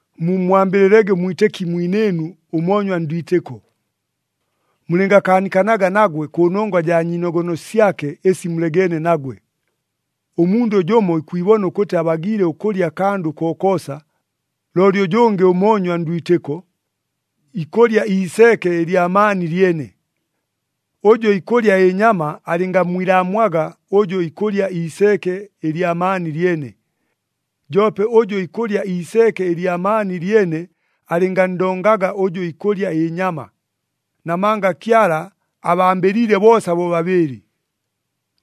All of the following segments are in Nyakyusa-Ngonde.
Mummwambɨlɨlege ʉmwitɨki mwinɨɨnu ʉmoonywa ndwitɨko. Mulɨngakaanikanaga nagwe kʉnongwa jaa nyiinogono syake ɨsi mulegeene nagwe. Ʉmundʉ jʉmo ikwibona ʉkʉtɨ abagiile ʉkʉlya akandʉ kokoosa, looli ʉjʉngɨ ʉmoonywa ndwitɨko, ikʉlya iiseeke ɨlya maani lyene. Ʉjʉ ikʉlya ɨnyama alɨngammwilaamwaga ʉjʉ ikʉlya iiseeke ɨlya maani lyene. Joope ʉjʉ ikʉlya iiseeke ɨlya maani lyene alɨnganndongaga ʉjʉ ikʉlya ɨnyama, namanga Kyala abambɨliile boosa bobabɨɨlɨ.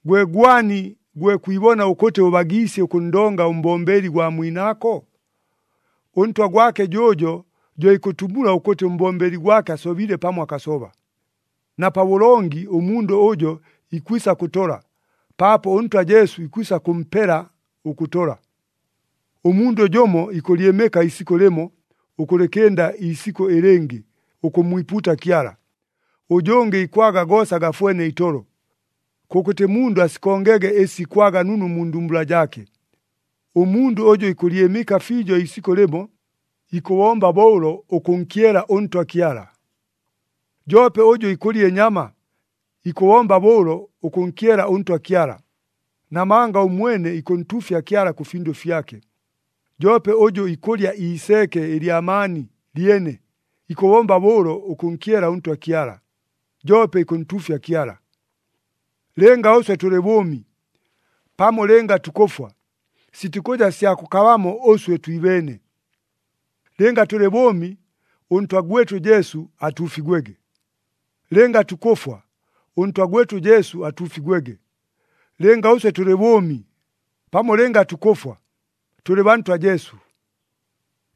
Gwe gwani gwe kwibona ʉkʉtɨ ʉbagiisye ʉkʉnndonga ʉmbombeli gwa mwinaako? Ʉntwa gwake jʉʉjo jo ikʉtumula ʉkʉtɨ ʉmbombeli gwake asobile pamo akasoba. Na pabʉlongi ʉmundʉ ʉjo ikwisa kʉtola, paapo ʉNtwa Jesu ikwisa kʉmpela ʉkʉtola. Ʉmundʉ jʉmo ikʉlyɨmɨka iisikʉ lɨmo ʉkʉlɨkɨnda iisikʉ ɨlɨngɨ ʉkʉmmwipuuta Kyala, ʉjʉngɨ ikwaga goosa gafwene itolo. Kʉkʉtɨ mundʉ asikongege ɨsi ikwaga nunu mu ndumbula jaake. Ʉmundʉ ʉjʉ ikʉlyɨmɨka fiijo iisikʉ lɨmo, ikʉbomba bo ʉlo ʉkʉnkyela ʉNtwa Kyala. Joope ʉjʉ ikʉlya ɨnyama, ikʉbomba bo ʉlo ʉkʉnkyela ʉNtwa Kyala, namanga ʉmwene ikʉntuufya Kyala kʉ findʉ fyake. Joope ʉjʉ ikʉlya iiseeke ɨlya maani lyene, ikʉbomba bo ʉlo ʉkʉnkyela ʉNtwa Kyala, joope ikʉntuufya Kyala. Lɨnga ʉswe tʉlɨ bʉʉmi, pamo lɨnga tukʉfwa, sitikʉja sya kʉkabamo ʉswe twibeene. Lɨnga tʉlɨ bʉʉmi, ʉNtwa gwɨtʉ Jesu atuufigwege. Lɨnga tukʉfwa, ʉNtwa gwɨtʉ Jesu atuufigwege. Lɨnga ʉswe tʉlɨ bʉʉmi, pamo lɨnga tukʉfwa, tʉlɨ baa Ntwa Jesu.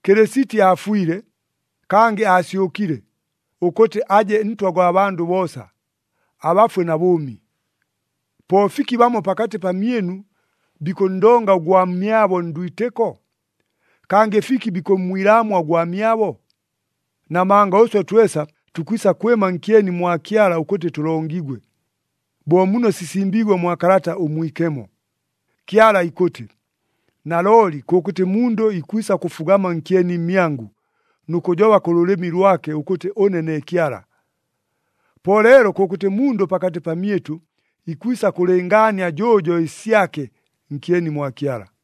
Kɨlɨsiti aafwile, kangɨ aasyʉkile, ʉkʉtɨ aje Ntwa gwa bandʉ boosa, abafwe na bʉʉmi. Po fiki bamo pakatɨ pamyɨnu bikʉnndonga ʉgwamyabo ndwitɨko? Kangɨ fiki bikʉmmwilaamwa ʉgwamyabo? Namanga ʉswe twesa tukwisa kwɨma nkyeni mwa Kyala ʉkʉtɨ tʉlongigwe. Bo muno sisimbiigwe mwa Kalata ʉMwikemo, “Kyala ikʉtɨ, ‘Nalooli kʉkʉtɨ mundʉ ikwisa kʉfugama nkyeni mmyangʉ, nʉ kʉjoba kʉ lʉlɨmi lwake ʉkʉtɨ ʉne ne Kyala.’” Po leelo kʉkʉtɨ mundʉ pakatɨ pamyɨtʉ, ikwisa kʉlɨngaania jʉʉjo ɨsyake nkyeni mwa Kyala.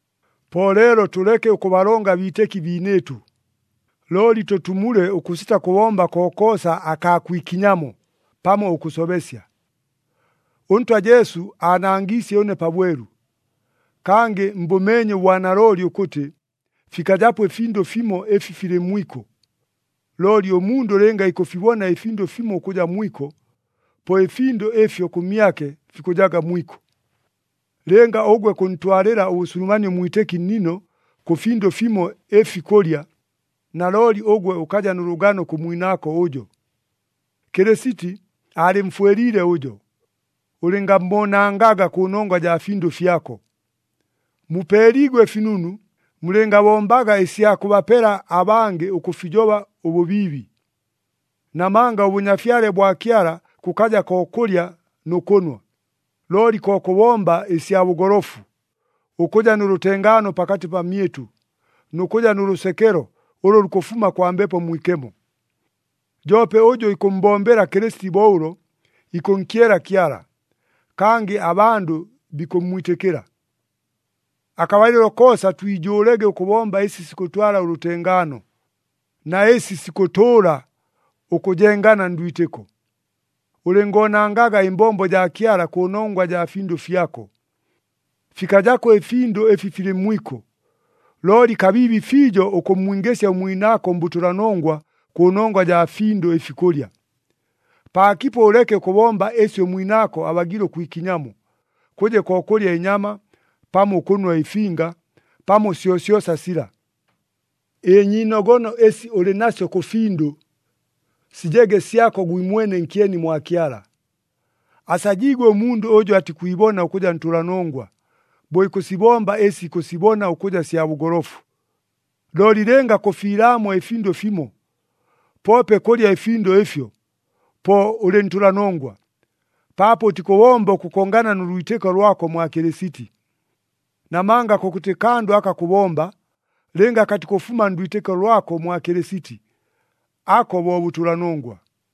Po leelo tʉleke ʉkʉbalonga abiitɨki biinɨɨtʉ. Looli tʉtumule ʉkʉsita kʉbomba kokoosa akaa kwikinyamo pamo ʉkʉsobesya. ɄNtwa Jesu aanangiisye ʉne pabwelu, kangɨ mbʉmeenye ʉbwanalooli ʉkʉtɨ, fikajapo ɨfindʉ fimo ɨfi filɨ mwiko. Looli ʉmundʉ lɨnga ikʉfibona ɨfindʉ fimo ʉkʉja mwiko, po ɨfindʉ ɨfyo kʉmyake fikʉjaga mwiko. Lɨnga ʉgwe kʉntwalɨla ʉbʉsulumanie ʉmwitɨki nnino kʉ findʉ fimo ɨfi kʉlya, nalooli ʉgwe ʉkaja nʉ lʉgano kʉ mwinaako ʉjo. Kɨlɨsiti aalɨmfwɨliile ʉjo. Ʉlɨngammoonangaga kʉnongwa jaa findʉ fyako! Mupeeliigwe ɨfinunu, mulɨngabombaga ɨsya kʉbapela abangɨ ʉkʉfijoba ʉbʉbiibi. Namanga ʉBʉnyafyale bwa Kyala kʉkaja ko kʉlya nʉ kʉnwa, looli ko kʉbomba ɨsya bʉgolofu, ʉkʉja nʉ lʉtengaano pakatɨ pamyɨtʉ, nʉ kʉja nʉ lʉsekelo ʉlʉ lukʉfuma kwa Mbepo Mwikemo. Joope ʉjʉ ikʉmmbombela Kɨlɨsiti bo ʉlo, ikʉnkyela Kyala, kangɨ abandʉ bikʉmmwitɨkɨla. Akabalɨlo koosa twijʉʉlege ʉkʉbomba ɨsi sikʉtwala ʉlʉtengaano, na ɨsi sikʉtʉʉla ʉkʉjengana ndwitɨko. Ʉlɨngoonangaga ɨmbombo jaa Kyala kʉnongwa jaa findʉ fyako. Fikajako ɨfindʉ ɨfi filɨ mwiko, looli kabiibi fiijo ʉkʉmmwingɨsya ʉmwinaako mbʉtʉlanongwa kʉnongwa jaa findʉ ɨfi kʉlya. Paakipo ʉleke ʉkʉbomba ɨsi ʉmwinaako abagiile ʉkwikinyamo, kʉje ko kʉlya ɨnyama, pamo ʉkʉnwa ɨfinga, pamo syosyosa sila. Ɨnyiinogono ɨsi ʉlɨ nasyo kʉ findʉ, sijege syako gwimwene nkyeni mwa Kyala. Asajiigwe ʉmundʉ ʉjʉ atikwibona ʉkʉja ntʉlanongwa, bo ikʉsibomba ɨsi ikʉsibona ʉkʉja sya bʉgolofu. Looli lɨnga kʉfiilaamwa ɨfindʉ fimo, poope kʉlya ɨfindʉ ɨfyo, po ʉlɨ ntʉlanongwa, paapo ʉtikʉbomba ʉkʉkongana nʉ lwitɨko lwako mwa Kɨlɨsiti. Namanga kʉkʉtɨ kandʉ aka kʉbomba, lɨnga katikʉfuma ndwitɨko lwako mwa Kɨlɨsiti, ako bo bʉtʉlanongwa.